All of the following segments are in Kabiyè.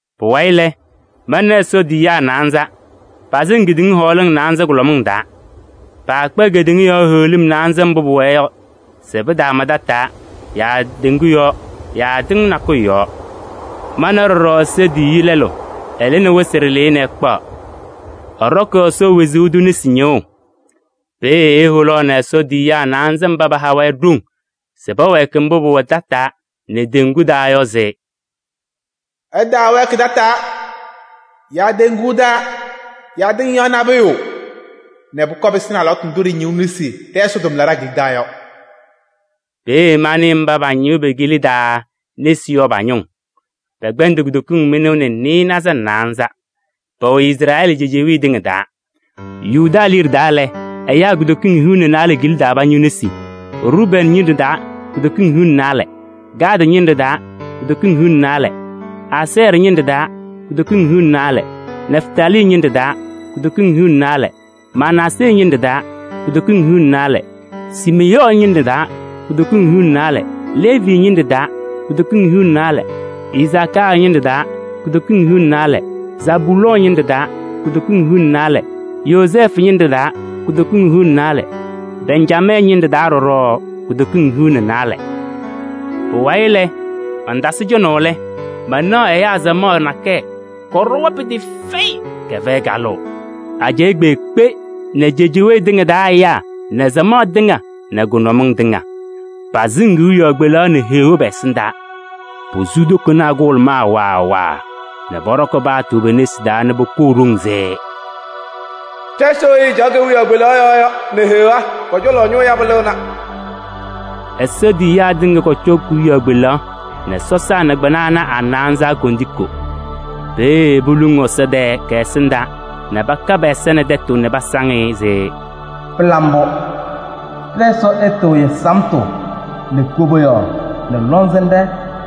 Pʋwayɩ lɛ, mana Ɛsɔ tiyiyaa naanza, pasɩŋ kedeŋa hɔɔlɩŋ naanza kʋlɔmɩŋ taa. Paakpa kedeŋa yɔɔ heɣlim naanza mbʋ pʋwɛɛ yɔ se pɩtaama tataa yaa teŋgu yɔɔ yaa tɩʋ nakʋyʋ yɔɔ. Mana ɖɔɖɔ Ɛsɔ tiyiyu lɛlʋ, ɛlɩnɩ wɩsɩ ɖɩlɩyɛ nɛ ɛkpaɣ. Ɛɖɔkɩ Ɛsɔ wezuu tʋ nesi ñɩɣʋ. Peeye eholuuni Ɛsɔ tiyiyaa naanza mba paha-wɛ ɖoŋ se pɛwɛɛkɩ mbʋ pʋwɛ tataa nɛ teŋgu taa yɔ se: “Ɩtaawɛɛkɩ tataa yaa teŋgu taa yaa tɩŋ yɔɔ nabʋyʋ nɛ pʋkɔɔ pɩsɩnɩ alɩwaatʋ ndʋ ɖɩñɩɣ nesi ɖɛ-Ɛsɔ tʋmlaɖaa kila taa yɔ.” Peeye manɩ mba pañɩɣ pe-kila taa nesi yɔ pa-ñʋʋ. Pɛkpɛndɩ kutokiŋ mɩnʋʋ nɛ nɩɩnaza nɛ naanza. Pɛwɛ Izrɛɛlɩ cejewee tɩŋa taa: Yuda liɖe taa lɛ, ɛyaa kutokiŋ hiu nɛ naalɛ kila taa pañɩɣ nesi. Rubɛɛnɩ ñɩnɖɛ taa kutokiŋ hiu nɛ naalɛ, Gaadɩ ñɩnɖɛ taa kutokiŋ hiu nɛ naalɛ. Asɛɛrɩ ñɩnɖɛ taa kutokiŋ hiu nɛ naalɛ, Nɛftalii ñɩnɖɛ taa kutokiŋ hiu nɛ naalɛ, Manaasee ñɩnɖɛ taa kutokiŋ hiu nɛ naalɛ. Siimeyɔɔ ñɩnɖɛ taa kutokiŋ hiu nɛ naalɛ, Leevi ñɩnɖɛ taa kutokiŋ hiu nɛ naalɛ, Isakaarɩ ñɩnɖɛ taa kutokiŋ hiu nɛ naalɛ. Zabulɔɔ ñɩnɖɛ taa kutokiŋ hiu nɛ naalɛ, Yozɛɛfʋ ñɩnɖɛ taa kutokiŋ hiu nɛ naalɛ, Bɛnjamɛɛ ñɩnɖɛ taa ɖɔɖɔ kutokiŋ hiu nɛ naalɛ. Pʋwayɩ mantasɩ cɔnaʋ lɛ, manaɣ ɛyaa samaɣ nakɛyɛ, kɔɖɔwa pɩtɩɩfɛyɩ, kɛfɛyɩ kalʋʋ: ajɛɛ kpeekpe nɛ cejewee tɩŋa taa ɛyaa nɛ samaɣ tɩŋa nɛ kʋnʋmɩŋ tɩŋa. Pasɩŋ kewiyaɣ kpelaɣ nɛ Heɣa pɛ-ɛsɩndaa. Posu tokonaa kʋhʋlʋmaa waa waa nɛ pɔɖɔkɩ paatʋ pe-nesi taa nɛ poholuu ɖoŋ se: “Ɖɛ-Ɛsɔ weyi ɛcaɣ kewiyaɣ kpelaɣ yɔɔ yɔ nɛ Heɣa pɔ-cɔlɔ ñʋʋ yabʋ lɩɣna!” Ɛsɔ tiyiyaa tɩŋa kɔcɔ kewiyaɣ kpelaɣ nɛ sɔsaa nɛ kpɩna ana a-naanza kondiko. Peeye poluŋ Ɛsɔ tɛɛ kɛ-ɛsɩndaa nɛ paka pɛ-ɛza nɛ tɛtʋ nɛ pasaŋ-ɩ se: “Pɩla mbʋ! Ɖɛ-Ɛsɔ ɛtɩɣyɩ samtʋ nɛ koboyaɣ nɛ lɔŋsɩnɖɛ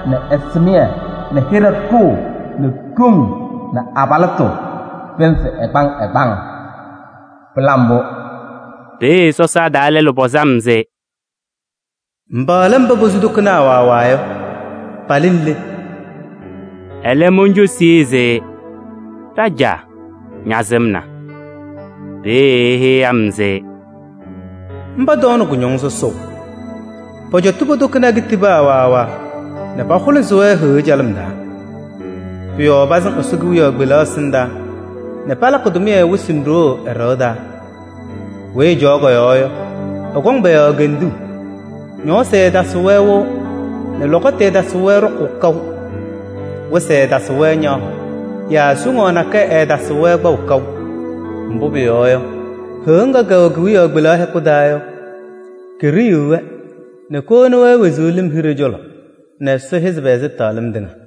nɛ ɛsɩmɩyɛ nɛ hɩɖɛ ɖʋʋ nɛ ɖoŋ nɛ abalɩtʋ pɩnzɩ ɛgbaŋ ɛgbaŋ! Pɩla mbʋ!” Peeye sɔsaa taa lɛlʋ pɔzɩ-m se: “Mba lɛ mba posu tokonaa kʋhʋlʋmaa waa waa yɔ. Palɩnɩ le?” Ɛlɛ moncosi-i se: “Ɖajaa! Ñasɩmna.” Peeye eheyi-m se: “Mba tɔɔnɩ kʋñɔŋ sɔsɔʋ. Pɔcɔtɩ po-tokonaa kitibaa waa waa nɛ pahʋlɩsɩ-wɛ Heɣa calɩm taa. Pʋ-yɔɔ pasɩŋ Ɛsɔ kewiyaɣ kpelaɣ ɛsɩndaa nɛ palakɩ-ɩ tʋmɩyɛ wɩsɩ nɛ ɖoo ɛ-ɖɩɣa taa. Weyi ɛcaɣ kɔ-yɔɔ yɔ, ɛkɔŋ pɔ-yɔɔ kenduu. Ñɔɔsɩ ɛɛtasɩɣ-wɛ wɩʋ nɛ lɔkɔtʋ ɛɛtasɩɣ-wɛ ɖɔkʋʋ kaʋ. Wɩsɩ ɛɛtasɩɣ-wɛ ñaɣʋ yaa soŋaɣ nakɛyɛ ɛɛtasɩɣ-wɛ kpaʋ kaʋ. Mbʋ pʋyɔɔ yɔ, Heɣa ŋga kɛwɛ kewiyaɣ kpelaɣ hɛkʋ taa yɔ, keɖiyiɣ-wɛ nɛ kowoni-wɛ wezuu lɩm hiɖe cɔlɔ nɛ Ɛsɔ hɛzɩ pɛ-ɛzɩtɛɣlɩm tɩŋa.”